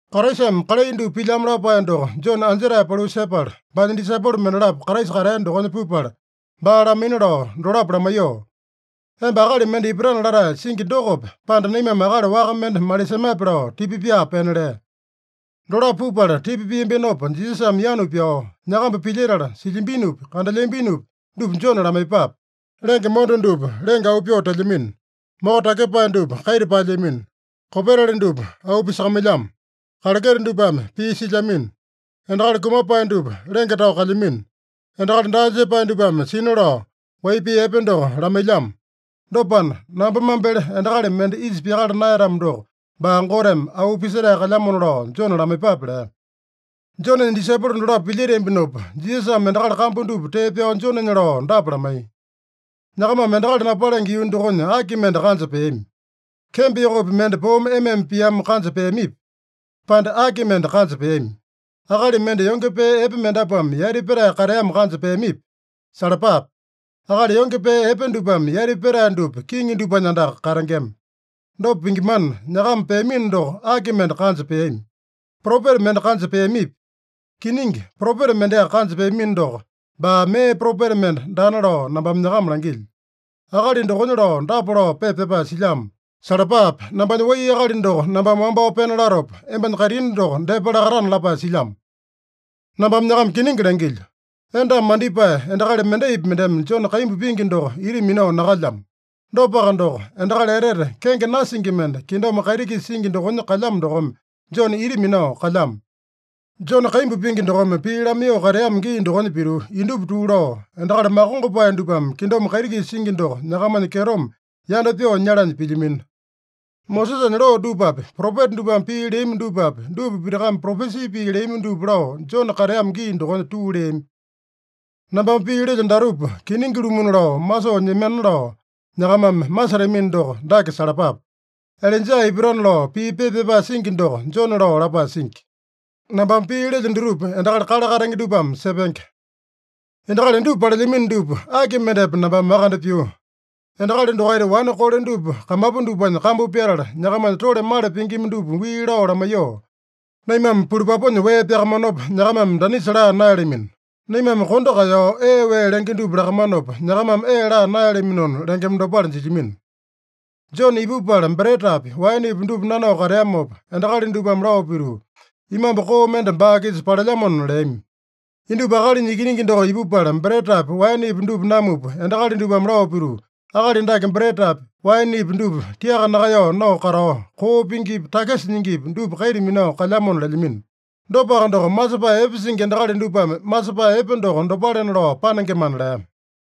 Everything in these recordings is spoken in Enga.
Kraisame kalai dupa pilyamo lapae doko Jone anjetae paliu sepala, baanya disaipolo mendalapo Kraisa katea dokonya pupala, baa lamaina lao dolapo lamaiyoo, “Emba akali mende ipatana latae singi dokope, pande naimame akali waka mende malisemape?” lao tipa pyaa pena lea. Dolapo pupala tipa piambinopa Jisasame yanu pyao, “Nyakamba pilyetala, silyambinopi, kandelyambinopi dupa Jone lamaiyepape. Lenge monda dupa lenge auu pyoo telyamino. Moko takyepae dupa kaita paelyamino. Kopetali dupa auu pisakamailyamo. Kaleketa dupame pii silyamino. Endakali kumapae dupa lenge tao kalyamino. Endakali daa jepae dupame sina lao wai pii epe doko lamailyamo. Dopana, namba mambele endakali mende isa pyakala naeyatamo doko, baa Goteme auu pisetae kalyamona lao Jone lamaiyepape” lea. Jonenya disaipolo dolapo pilyeteambinopa, Jisasame endakali kambu dupa tee pyao Jonenya lao dapa lamaiya: “Nyakamame endakali napalenge yuu dokonya aki mende kanja peami? Kembo yokopi mende poome ema-ema piamo kanja peamipi, pande aki mende kanja peami? Akali mende yonge pee epe mendapuame yati petae kateamo kanja peamipi? Salapape! Akali yonge pee epe dupame yati petae dupa kiŋi dupanya andaka katengema. Dopa pingimana, nyakama peamino doko aki mende kanja peami? Propeta mende kanja peamipi? Kiningi propeta mendeaka kanja peamino doko, baa mee propeta mende daana lao nambame nyakama langilyo. Akali dokonya lao dapa lao pepa pyapae silyamo: ‘Salapape! Nambanya wai akali doko nambame wambao pena latopa, embanya kaitini doko depa lakatana’ lapae silyamo. Nambame nyakama kiningi langilyo: Endame mandipae endakali mendaipi mendeme Jone kaimbu pingi doko ita minao nakalyamo. Dopaka doko, endakali etete kenge nasingi mende, kingdom kaiti-kisa singi dokonya kalyamo dokome Jone ita minao kalyamo. Jone kaimbu pingi dokome pii lamaiyoo kateamo gii dokonya pituu, indupa tuu lao, endakali makongopae dupame kingdom kaiti-kisa singi doko nyakamanya kyetome yanda pyoo nyalanya pilyamino. Mosesanya loo dupapi, propeta dupame pii leami dupapi, dupa pitakame propesi pii leami dupa lao Jone kateamo gii dokonya tuu leami. Nambame pii lelyo datupa kiningi-lumuna lao masoo nyemana lao nyakamame masetamino doko, dake salapape: Ilaija ipatana lao pii pepa pyapae singi doko, Jone lao lapae singi. Nambame pii lelyo dutupa endakali kale katenge dupame sepenge. “Endakali indupa palelyamino dupa, aki mendepa nambame makande pyuu? Endakali dokaita wane kole dupa kamapu dupanya kambu pyatala, nyakamanya tole male pingima dupa wii lao lamaiyoo, ‘Naimame pulupapunya wee pyakamanopa, nyakamame danisa laa naeyalamino. Naimame kondo kaeyao ee wee lenge dupa lakamanopa, nyakamame ee laa naeyalaminona’ lengema dopale jilyamino. Jone ipupala, bretapi, waenepi dupa nanao kateamopa, endakali dupame lao pituu, ‘Imambu koo mende baa-kisa palelyamona’ leami. Indupa Akalinya Ikiningi doko ipupala bretapi, waenepi dupa namupa, endakali dupame lao pituu, ‘Akali dake bretapi, waenepi dupa tiaka nakaeyao nao katao, koo pingipi, takisa nyingipi dupa kaita minao kalyamona’ lelyamino. Dopaka doko, masepae epe singi endakali dupame masepae epe doko dopalena lao panengemana” lea.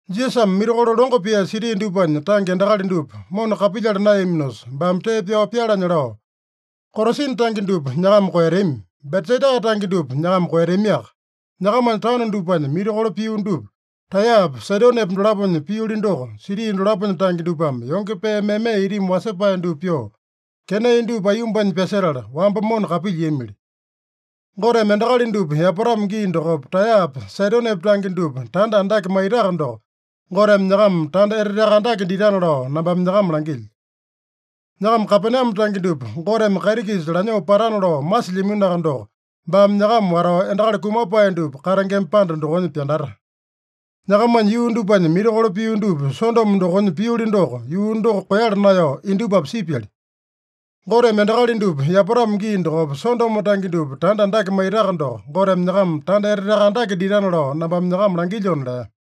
Jisasame mirakolo longo pia siti dupanya tange endakali dupa mona kapilyala naeyaminosa, baame tee pyao pyalanya lao, “Korasina tange dupa nyakama koeyatami. Betsaida tange dupa nyakama koeyatamiaka. Nyakamanya taono dupanya mirakolo pio dupa, Taeyapa, Saidonepa dolaponya pioli doko, siti dolaponya tange dupame yonge pee meme itimi wasepae dupa pyoo, kenai dupa aiyombanya pyasetala, wamba mona kapilyiamili. Goteme endakali dupa yapatamo gii dokopa Taeyapa, Saidonepa tange dupa tanda andake maitaka doko, Goteme nyakama tanda eteteaka andake ditana lao nambame nyakama langilyo. Nyakama Kapename tange dupa Goteme kaiti-kisa lanyoo patana lao masilyaminoaka doko, baame nyakama watao endakali kumapae dupa katengema panda dokonya pyandata. Nyakamanya yuu dupanya mirakolo pio dupa, Sodomo dokonya pioli doko, yuu doko koeyala naeyao indupapi sipyali. Goteme endakali dupa yapatamo gii dokopa Sodomo tange dupa tanda andake maitaka doko, Goteme nyakama tanda eteteaka andake ditana lao nambame nyakama langilyona” lea.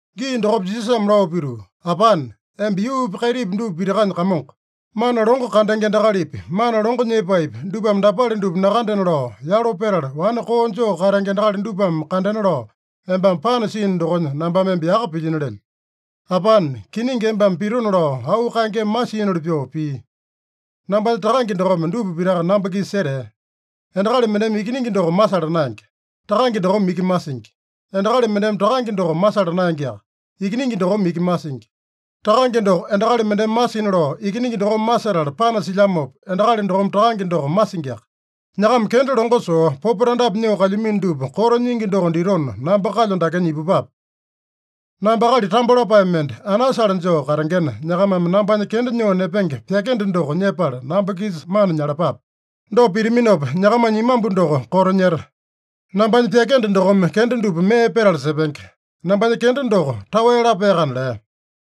Gii dokopa Jisasame lao pituu, “Apane, emba yuupi, kaitipi dupa pitakanya Kamongo. Mana longo kandenge endakalipi, mana longo nyepaepi, dupame dapale dupa nakandena lao yalo petala, wane koo joo katenge endakali dupame kandena lao embame panasiino dokonya nambame emba yaka pilyino lelyo. Apane, kiningi embame pitona lao auu kaengeme masiinoli pyoo pii. Nambanya Takange dokome dupa pitaka namba-kisa setea. Endakali mendeme Ikiningi doko masala naenge. Takange dokome iki masingi. Endakali mendeme Takange doko masala naengeaka. Ikiningi dokome iki masingi. Takange doko endakali mendeme masina lao Ikiningi dokome masetala panasilyamopa, endakali dokome Takange doko masingiaka. Nyakama kenda longo soo, popo tandapi nyoo kalyamino dupa koto nyingi doko ditona, namba kalyo dakenya ipupape. Namba akali tambo lapae mende, anasale joo katengena, nyakamame nambanya kenda nyoo nepenge pyakende doko nyepala namba-kisa mana nyalapape. Dopa pitaminopa, nyakamanya imambu doko koto nyeta. Nambanya pyakende dokome kenda dupa mee petala sepenge. Nambanya kenda doko taowe lapaeyakana” lea.